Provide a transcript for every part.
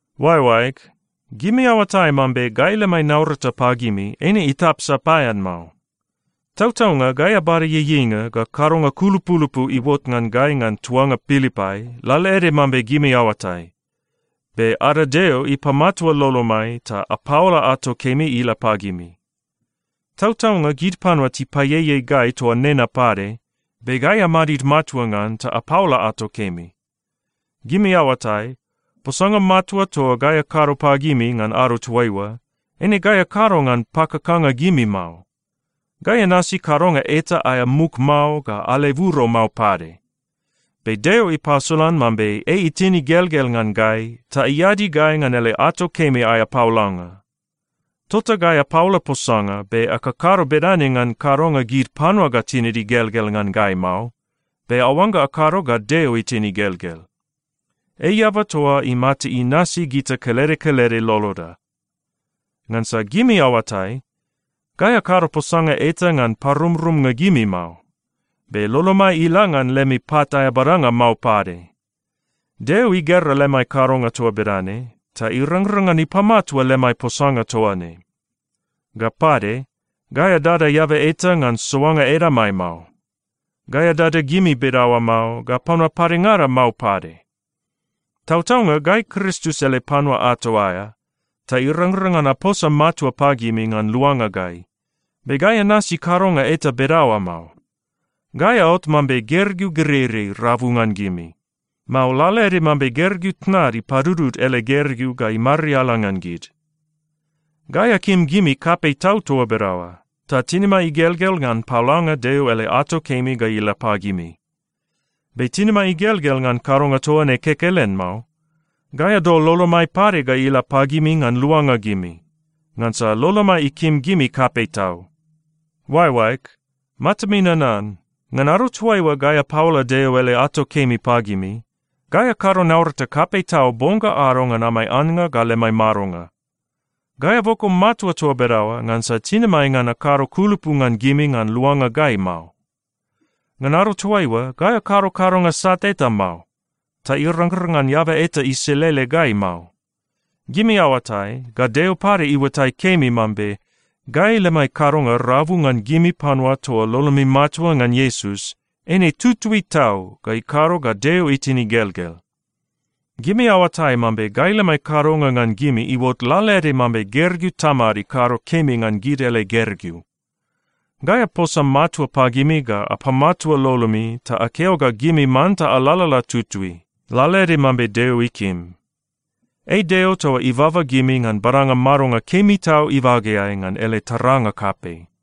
Oaeoaeg, gimi aoatai mambe gai lemai naurata pagimi eine itap sapaean mao. Tautaunga gai abada ieieinga, ga kadonga kulupulupu iuot ngan gai ngan tuanga Pilipai lalaede mambe gimi aoatai, be ada Deo ipamatua lolomai ta apaola ato kemi ila pagimi. Tautaunga gid panua tipaieiei gai toa nena pade, be gai amadid matua ngan ta apaola ato kemi. Gimi aoatai, posanga matua toa gai akado pagimi ngan ado toaiua, eine gai akado ngan pakakanga gimi mao. Gai anasi kadonga eta aea muk mao ga aleburo mao pade. Be Deo ipasolan mambe ei itin igelgel ngan gai ta iadi gai ngan ele ato kemi aea paolanga. Tota gai apaola posanga, be akakado bedane ngan kadonga gid panua ga tinid igelgel ngan gai mao, be aoangga akado ga Deo itin igelgel. Ei eaba toa imata inasi gita kelede kelede loloda. Ngansa gimi aoatai, gai akado posanga eta ngan parumrumnga gimi mao. Be lolomai ila ngan lemi pat aea badanga mao pade. Deo igera lemai kadonga toa bedane ta irangrang ngan ipamatua lemai posanga toa ne. Ga pade, gai adada eaba eta ngan soanga edamai mao. Gai adada gimi bedaoa mao, ga panua padengada mao pade. Tautaunga gai Kristus ele panua ato aea, ta irangrang ngan aposa matua pagimi ngan luanga gai, be gai anasi kadonga eta bedaoa mao. Gai aot mambe gergeu gereirei rabu ngan gimi, mao lalaede mambe gergeu tnad ipadudud ele gergeu ga imariala ngan gid. Gai akim gimi kapei tau toa bedaoa, ta tinimai igelgel ngan paolanga Deo ele ato kemi ga ila pagimi. Be tinimai igelgel ngan kadonga toa ne kekelen mao. Gai adol lolomai pade ga ila pagimi ngan luanga gimi, ngansa lolomai ikim gimi kapei tau. Oaeoaeg, matami nanan, ngan ado toaiua gai apaola Deo ele ato kemi pagimi, gai akado naurata kapei tau bong ga ado ngan amai annga ga lemai madonga. Gai aboko matua toa bedaoa ngansa tinimai ngan akado kulupu ngan gimi ngan luanga gai mao. Ngan ado toaiua, gai akado kadonga sat eta mao, ta irangrang ngan eaba eta iselele gai mao. Gimi aoatai, ga Deo pade iuatai kemi mambe gai lemai kadonga rabu ngan gimi panua toa lolomi matua ngan Iesus, eine tutui tau ga ikado ga Deo itin igelgel. Gimi aoatai mambe gai lemai kadonga ngan gimi iuot lalaede mambe gergeu tamad ikado kemi ngan gid ele gergeu. Gai aposa matua pagimi ga apamatua lolomi ta akeo ga gimi manta alalala tutui, lalaede mambe Deo ikim. Ei Deo toa ibaba gimi ngan badanga madonga kemi tau ibageai ngan ele taranga kapei.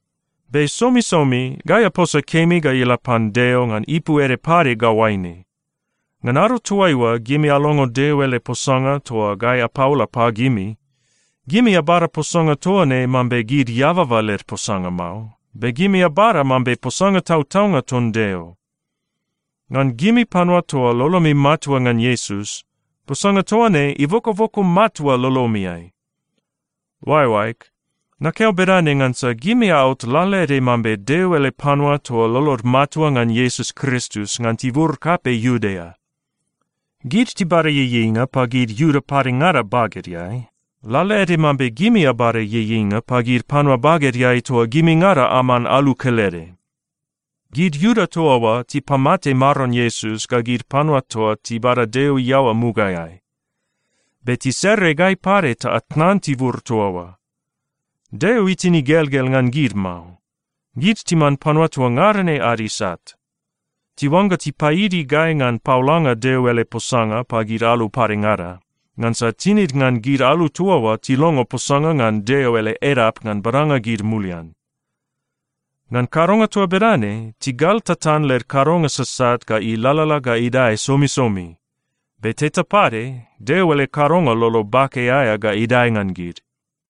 Be somisomi gai aposa kemi ga ila pan Deo ngan ipu ede pade ga oaine: Ngan ado toaiua gimi alongo Deo ele posanga toa gai apaola pagimi, gimi abada posanga toa ne mambe gid eababa led posanga mao, be gimi abada mambe posanga tautaunga ton Deo. Ngan gimi panua toa lolomi matua ngan Iesus, posanga toa ne ibokoboko matua lolomiai. Oaeoaeg, nakeo bedane ngansa gimi aot lalaede mambe Deo ele panua toa lolod matua ngan Iesus Kristus ngan tibur kapei Iudea. Gid tibada ieieinga pagid Iuda padengada bagedeai, lalaede mambe gimi abada ieieinga pagid panua bagedeai toa gimingada aman alu kelede. Gid Iuda toa oa tipamate Maron Iesus ga gid panua toa tibada Deo iaoa mugaeai. Be tisere gai pade ta atnan tibur toa oa. Deo itin igelgel ngan gid mao. Gid timan panua toa ngada ne ad isat. Tiuangga tipaidi gai ngan paolanga Deo ele posanga pagid alu padengada, ngansa tinid ngan gid alu toa oa tilongo posanga ngan Deo ele edap ngan badanga gid mulian. Ngan kadonga toa bedane, tigal tatan led kadonga sasat ga ilalala ga idae somisomi. Be teta pade Deo ele kadonga lolo bake aea ga idae ngan gid.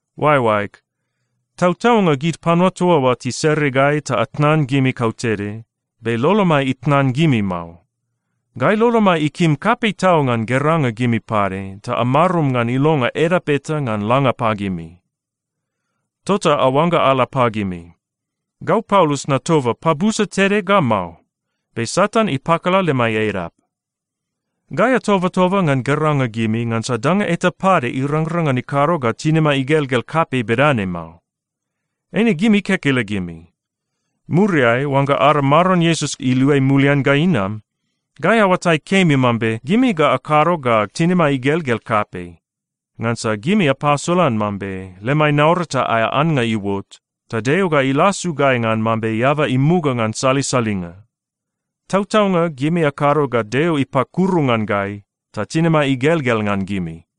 Oaeoaeg, tautaunga gid panua toa oa tisere gai ta atnan gimi kautede. Be lolomai itnan gimi mao. Gai lolomai ikim kapei tau ngan geranga gimi pade ta amarum ngan ilonga edap eta ngan langa pagimi. Tota aoangga ala pagimi. Gau Paulus natoba pabusa tede ga mao. Be Satan ipakala lemai edap. Gai atobatoba ngan geranga gimi ngansa danga eta pade irangrang ngan ikado ga tinimai igelgel kapei bedane mao. Eine gimi kekelegimi. Muriai oangga ada Maron Iesus iluai mulian ga inam, gai aoatai kemi mambe gimi ga akado ga tinimai igelgel kapei, ngansa gimi apasolan mambe lemai naurata aea annga iuot, ta Deo ga ilasu gai ngan mambe eaba imuga ngan salisalinga. Tautaunga gimi akado ga Deo ipakuru ngan gai, ta tinimai igelgel ngan gimi.